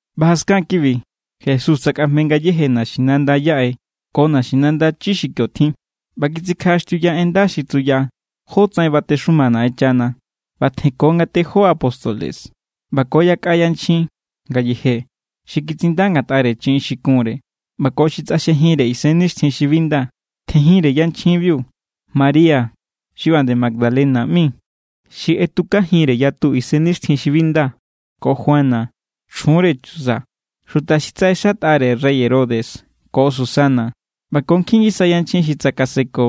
ꞌBa jaskan kibi, Jesús tsakꞌajme ngayéje naxinanda yaꞌe ko naxinanda chi xi kio tjin, ꞌba kitsikjaꞌaxtiuya en nda xi tsuya jótsaꞌen batexuma Naꞌenchana. ꞌBa tjenko nga tejó apóstoles ꞌba ko yakꞌa yanchjin ngayeje xi kitsinda ngatꞌare chiꞌin xi kunre ꞌba ko xi tsꞌaxjejinre isennixtjin xi bi nda. Tjenjinre yanchjinbiu María xi ꞌba nde Magdalena ꞌmi, xi ꞌetukajinre yatu isennixtjin xi bi nda, ko Juana, chjunre Chuza, xuta xi tsaꞌexatꞌare rey Herodes, ko Susana ꞌba ko nkjin ngisa yanchjin xi tsakaseko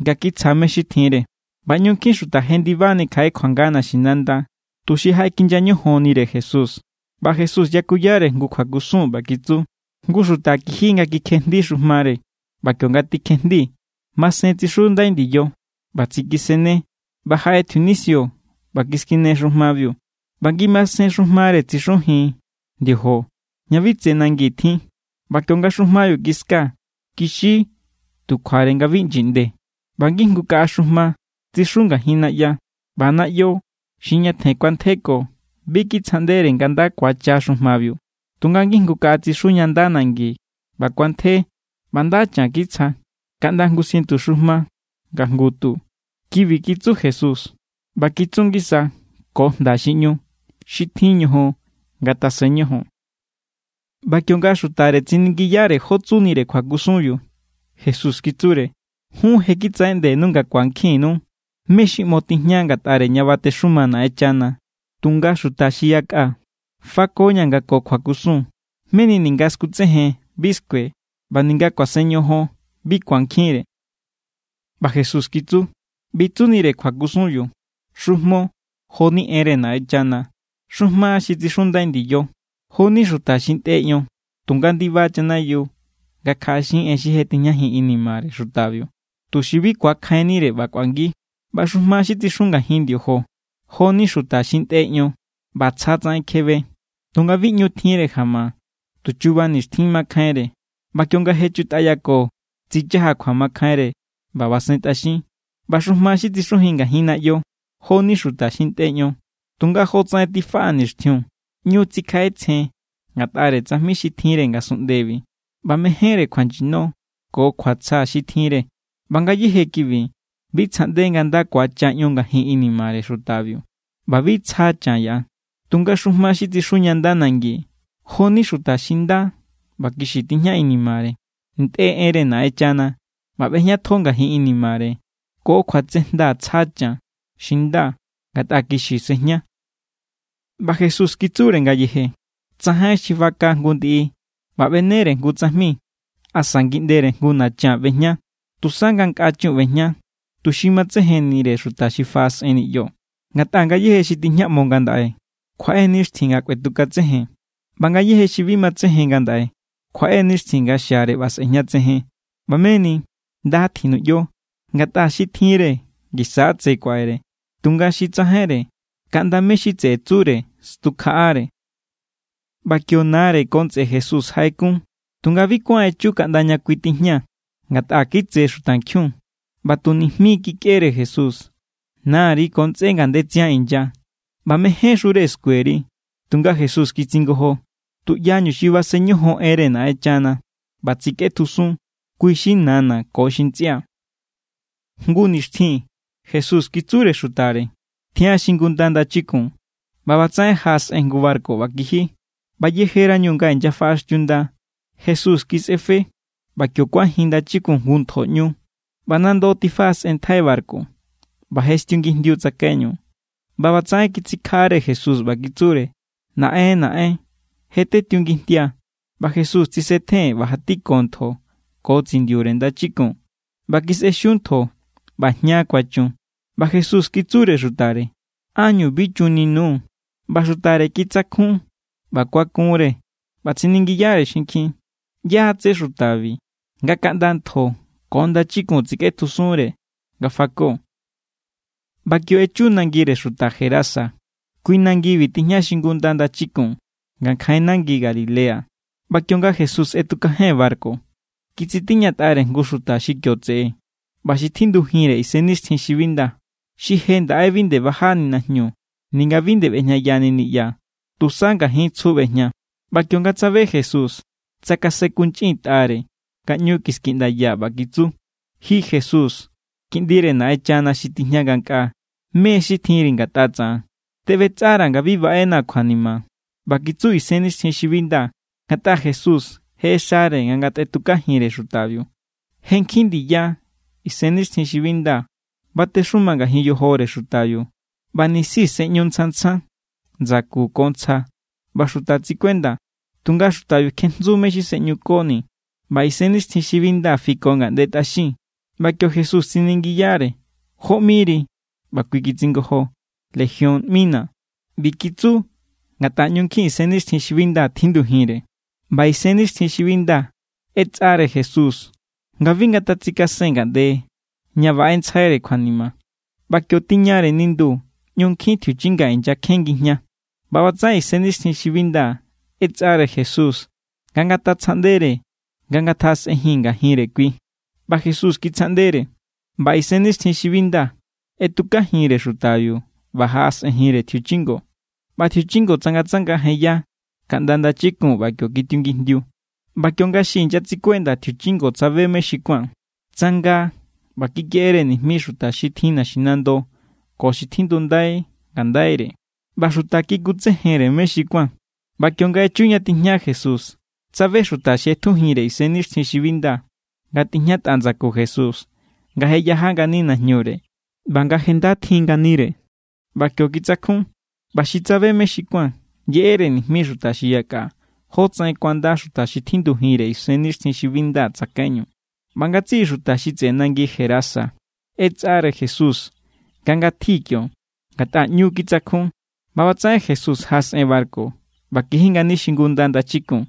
nga kitsja mé= xi tjinre. ꞌBa ꞌñu nkjin xuta jendibani kjaꞌe kjuanga naxinanda tuxi jaꞌekinya ñojonnire Jesús. ꞌBa Jesús yakuyare jngu kjuakusun ꞌba kitsu: —Jngu xuta kiji nga kikjejndi xujmare. ꞌBa kionga tikjejndi, masen tsixundai ndiyo. ꞌBa tsikisenne. ꞌBa jaꞌe tjiunisio ꞌba kiskine xujmabiu. ꞌBa ngimasen xujmare tsixujin ndiojo ña bi tse nangi tjin. ꞌBa kionga xujmabiu kiska, kixi tu kjuare nga bi ꞌnyiꞌnde. ꞌBa ngijngu kaꞌa xujma tsixu ngajin naꞌya. ꞌBa naꞌyo xi ñatjen kuantjeko bi kitsjaꞌndere nga nda kuacha xujmabiu. Tunga ngijngu kaꞌa tsixu ña nda nangi ꞌba kuantje ꞌba nda chan kitsja, kaꞌnda jngu ciento xujma nga jngu tu. Kibi kitsu Jesús, ꞌba kitsu ngisa ko jnda xi ꞌñu: —Xi tjin ñojon, ngatasen ñojon. ꞌBa kionga xutare tsiningiyare jó tsunire kjuakusunbiu, Jesús kitsure: —Jun je kitsaꞌeꞌndenu nga ku̱ankjinnu mé= xi ꞌmo tijña ngatꞌare ña batexuma Naꞌenchana. Tunga xuta xi yakꞌa, fakoña̱ nga ko kjuakusun, meni ninga skutsejen bi skue, ꞌba ninga kuasen ñojon bi ku̱ankjinre. ꞌBa Jesús kitsu: —ꞌBi= tsunire kjuakusunbiu. Xujmo, jo=ni enre Naꞌenchana. Xujma xi tsixundai ndiyo, jo=ni xuta xi ntꞌe ion tunga ndiba chanayiu nga kjaꞌaxin en xi je tijñajin inimare xutabiu, tuxi bi ku̱akjainnire ꞌba kꞌuangi. ꞌBa xujma xi tsixu ngajin ndiojo, jo=ni xuta xi ntꞌe ion ꞌba tsja tsaꞌen kjebe. Tunga bi ꞌñu tjinre jama. Tu chuba nixtjin makjainre, ꞌba kionga chutꞌayako, tsichaja kjuamakjainre ꞌba basentꞌaxin. ꞌBa xujma xi tsixu ngajin naꞌyo, jo=ni xuta xi ntꞌe ion, tunga jotsaꞌen tifaꞌa nixtjiun, ꞌñu tsikjaꞌetsjen ngatꞌare tsajmi xi tjinre ngasunꞌndebi ꞌba mejénre kjuanyino ko kjuatsja xi tjinre. ꞌBa ngayéje kibi bi tsjaꞌnde nga nda ku̱acha ion ngajin inimare xutabiu, ꞌba bi tsja chan yaꞌa. Tunga xujma xi tsixu ña nda nangi, jo=ni xuta xi nda ꞌba kixi tijña inimare. Ntꞌe enre Naꞌenchana ꞌba ꞌbejñatjo ngajin inimare. Ko kjuatsejnda tsja chan xi nda, ngatꞌa kixi sejña. ꞌBa Jesús kitsure ngayeje: —Tsajain xi baka jngu ndiꞌi ꞌba ꞌbenere jngu tsajmi asa ngiꞌndere jngu nachan ꞌbejña. Tusa nga nkꞌa chun ꞌbejña, tuxi matsejennire xuta xi faꞌasꞌen niꞌyo. Ngatꞌa ngayéje xi tijñaꞌmo ngandaꞌe, kjuaꞌe nixtjin nga kꞌuetukatsejen. ꞌBa ngayéje xi bi matsejen ngandaꞌe, kjuaꞌe nixtjin nga xiare ꞌba sꞌe̱jñatsejen. ꞌBa meni, nda tjinuꞌyo. Ngatꞌa xi tjinre, ngisa= tse kuaꞌere. Tunga xi tsajainre, kaꞌnda mé= xi tseꞌe tsure stukjaꞌare. ꞌBa kio nare ko ntsꞌe Jesús jaꞌekun, tunga bi kuán echu kaꞌnda ña kui tijña, ngatꞌa kitse xutankjiun. ꞌBa tu nijmi= kikꞌere Jesús: —Nari ko ntsꞌé ngandetsian inya ꞌba mejénxure skueri. Tunga Jesús kitsingojo: —Tuꞌyañu xi basen ñojon enre Naꞌenchana ꞌba tsikꞌetjusun, kui= xi nana̱ ko xi ntsꞌia̱. Jngu nixtjin Jesús kitsure xutare: —Tjian xingunda ndachikun. ꞌBa ꞌbatsaꞌen jaꞌasꞌen jngu barku ꞌba kiji. ꞌBa yejerañu nga inyafaꞌaxtiunda, Jesús kisꞌefe. ꞌBa kio kuanjin ndachikun jngu ntjoꞌñu, ꞌba nando tifaꞌasꞌenntjai barku. ꞌBa je stiungijndiu tsakaiñu. ꞌBa ꞌbatsaꞌen kitsikjaꞌare Jesús, ꞌba kitsure: —¡Naꞌen, naꞌen! ¡Je tetiungijndia! ꞌBa Jesús tsisetjen ꞌba jatiko ntjo ko tsindiure ndachikun. ꞌBa kisꞌexiu ntjo ꞌba jña kuachun. ꞌBa Jesús kitsure xutare: —¿Ánñu bi chunni_nuu̱? ꞌBa xutare kitsakjun ꞌba kuakunre ꞌba tsiningiyare xinkjin: —¿Yá= tsé xutabi nga kaꞌnda ntjo ko ndachikun tsikꞌetjusunre nga fako? ꞌBa kio echu nangire xuta Gerasa. Kui nangibi tijña xingunda ndachikun, ngankjain nangi Galilea. ꞌBa kionga Jesús ꞌetukajen barku, kitsitiñatꞌare jngu xuta xi kio tseꞌe ꞌba xi tjindujinre isennixtjin xi bi nda. Xi je ndaꞌe bi nde bajani najñu ninga bi nde ꞌbejñayani niꞌya. Tusa ngajin tsju ꞌbejña. ꞌBa kionga tsabe Jesús, tsakasenkunchꞌintꞌare nga ꞌñu kiskiꞌndaya, ꞌba kitsu: —Ji Jesús, Kiꞌndire Naꞌenchana xi tijña ngankꞌaa, ¿mé= xi tjinri ngatꞌa tsaꞌan? Teꞌbetsꞌara̱ nga bi baꞌenaa̱ kjuanima. ꞌBa kitsu isennixtjin xi bi nda, ngatꞌa Jesús je ꞌexare nga ngatꞌetukajinre xutabiu. Je nkjin ndiya isennixtjin xi bi nda batexuma ngajin yojore xutabiu, ꞌba nisi sꞌeꞌñu tsjan tsjan ndsaku ko ntsja ꞌba xuta tsikuenda, tunga xutabiu kjejntsu mé= xi sꞌeꞌñukonii̱, ꞌba isennixtjin xi bi nda fiko ngaꞌnde tꞌaxin. ꞌBa kio Jesús tsiningiyare: —¿Jó ꞌmiri? ꞌBa kui kitsingojo: —Legión ꞌmina̱. ꞌBi kitsu ngatꞌa ꞌñu nkjin isennixtjin xi bi nda tjindujinre. ꞌBa isennixtjin xi bi nda ꞌetsꞌare Jesús nga bi ngatatsikasen ngaꞌnde ña baꞌentsjaire̱ kjuanima. ꞌBa kio tiñare nindu ꞌñu nkjin tjiuchinga inyakjen ngijña. ꞌBa ꞌbatsaꞌen isennixtjin xi bi nda ꞌetsꞌare Jesús nga ngatatsjaꞌndere nga ngatjaꞌasꞌen ngajinre kui, ꞌba Jesús kitsjaꞌndere. ꞌBa isennixtjin xi bi nda ꞌetukajinre xutabiu ꞌba jaꞌasꞌenjinre tjiuchingo. ꞌBa tjiuchingo tsangatsanga jenya kaꞌnda ndachikun ꞌba kio kitiungijndiu. ꞌBa kionga xi inyatsikuenda tjiuchingo tsabe mé= xi kuán, tsanga ꞌba kikeꞌere nijmi xuta xi tjin naxinando ko xi tjindundai ngandaire. ꞌBa xuta kikutsejenre mé= xi kuán. ꞌBa kionga echu ña tijña Jesús, tsabe xuta xi ꞌetjujinre isennixtjin xi bi nda nga tijñatꞌa ndsaku Jesús nga je yaja ngani najñure ꞌba nga je nda tjin nganire. ꞌBa kio kitsakjun. ꞌBa xi tsabe mé= xi kuán, yeꞌere nijmi xuta xi yakꞌa jótsaꞌen kuanda xuta xi tjindujinre isennixtjin xi bi nda tsakaiñu. ꞌBa ngatsiꞌi xuta xi tseꞌe nangi Gerasa ꞌetsꞌare Jesús nga ngatji kio, ngatꞌa ꞌñu kitsakjun. ꞌBa ꞌbatsaꞌen Jesús jaꞌasꞌen barku ꞌba kiji ngani xingunda ndachikun.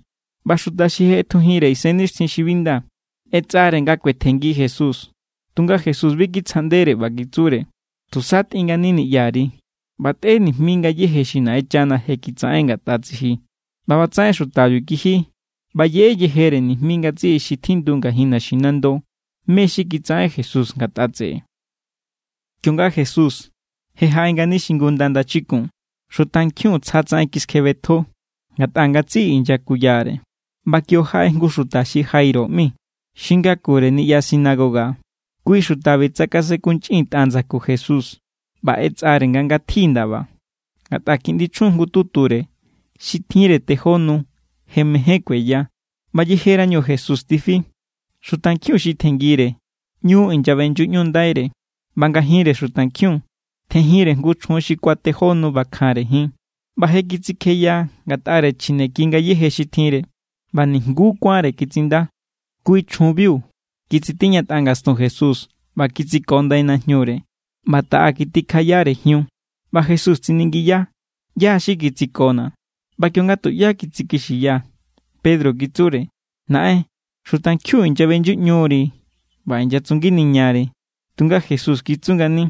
ꞌBa xuta xi je ꞌetjujinre isennixtjin xi bi nda ꞌetsꞌare nga kuetjenngi Jesús. Tunga Jesús bi kitsjaꞌndere ꞌba kitsure: —Tusa tꞌin ngani niꞌyari ꞌba tꞌe nijmi ngayéje xi Naꞌenchana je kitsaꞌen ngatꞌa tsiji. ꞌBa ꞌbatsaꞌen xutabiu kiji ꞌba yeꞌe yejere nijmi ngatsiꞌi xi tjindu ngajin naxinando mé= xi kitsaꞌen Jesús ngatꞌa tseꞌe. Kionga Jesús je jaꞌe ngani xingunda ndachikun, xutankjiun tsja tsaꞌen kiskjebetjo, ngatꞌa ngatsiꞌi inyakuyare. ꞌBa kio jaꞌe jngu xuta xi Jairo ꞌmi, xi ngakure niꞌya sinagoga. Kui xutabi tsakasenkunchꞌintꞌa ndsaku Jesús ꞌba ꞌetsꞌare nga ngatji ndaba, ngatꞌa kiꞌndi chjun jngututure xi tjinre tejó nu je mejen kueya. ꞌBa yejerañu Jesús tifi, xutankjiun xi tjenngire ꞌñu inyaꞌbeꞌnyuꞌñundaire. ꞌBa ngajinre xutankjiun tjenjinre jngu chjun xi kuatejó nu ꞌbakjanre jin. ꞌBa je kitsikjeya ngatꞌare chjineki ngayéje xi tjinre, ꞌba nijnguú kuánre kitsinda. Kui chjunbiu kitsitiñatꞌa ngastun Jesús ꞌba kitsiko ndai najñure, ꞌba taꞌa kitikjayare jiun. ꞌBa Jesús tsiningiya: —¿ꞌYá= xi kitsikona̱? ꞌBa kionga tuꞌyá kitsikixiya, Pedro kitsure: —Naꞌen, xutankjiun inyaꞌbeꞌnyuꞌñuri ꞌba inyatsunginiñari. Tunga Jesús kitsu ngani: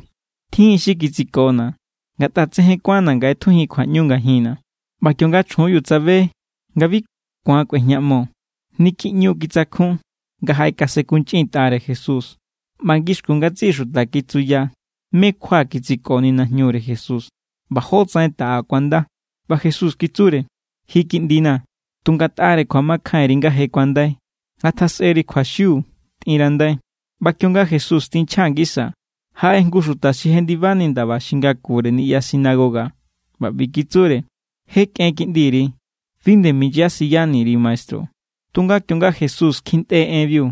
—Tjin= xi kitsikona̱, ngatꞌa tsejen kuánna̱ nga ꞌetjujin kjuaꞌñu ngajinna̱. ꞌBa kionga chjunbiu tsabe nga bi ku̱an kꞌuejñaꞌmo, niki ꞌñu= titsakjun nga jaꞌekasenkunchꞌintꞌare Jesús. ꞌBa ngixkun ngatsiꞌi xuta kitsuya mé= kjua kitsikoni najñure Jesús ꞌba jótsaꞌen taꞌa kuanda. ꞌBa Jesús kitsure: —Ji, kiꞌndina̱, tu ngatꞌare kjuamakjainri nga je kuandai. Ngatjasꞌeri kjuaxiu. Tꞌinrandai. ꞌBa kionga Jesús tinchja ngisa, jaꞌe jngu xuta xi jendibani ndaba xi ngakure niꞌya sinagoga ꞌba ꞌbi kitsure: —Je kꞌen kiꞌndiri. Bi nde minyasiyani_ri maestru. Tunga kionga Jesús kjintꞌe enbiu,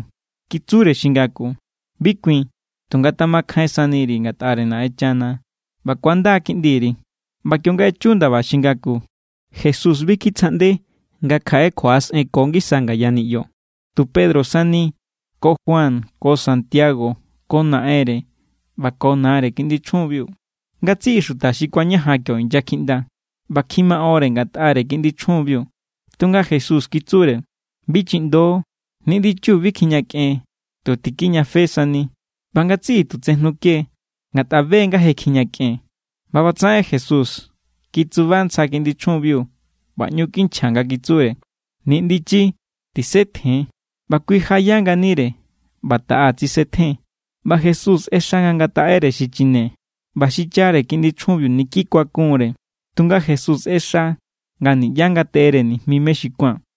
kitsure xi ngaku: —Bi kuin. Tu ngatamakjain saniri ngatꞌare Naꞌenchana ꞌba ku̱anda kiꞌndiri. ꞌBa kionga echu ndaba xi ngaku, Jesús bi kitsjaꞌnde nga kjaꞌe kjuaꞌasꞌenko ngisa ngaya niꞌyo, tu Pedro sani ko Juan ko Santiago ko naꞌenre ꞌba ko nare kiꞌndi chjunbiu. Ngatsiꞌi xuta xi kuañajan kio inyakjiꞌnda ꞌba kjimaꞌonre ngatꞌare kiꞌndi chjunbiu. Tunga Jesús kitsure: —Bi chiꞌndo. Niꞌndichiu bi kjijñakꞌen; tu tikijñafe sani. ꞌBa ngatsiꞌi tu tsejnuke=, ngatꞌa be= nga je kjijñakꞌen. ꞌBa ꞌbatsaꞌen Jesús kitsuba ntsja kiꞌndi chjunbiu ꞌba ꞌñu kinchja nga kitsure: —Niꞌndichi, tisetjen. ꞌBa kui jaꞌaya nganire ꞌba taꞌa tsisetjen. ꞌBa Jesús ꞌexa nga ngataꞌere xichine. ꞌBa xichare kiꞌndi chjunbiu niki kuakunre, tunga Jesús ꞌexa nga niꞌyá ngateꞌere nijmi mé= xi kuán.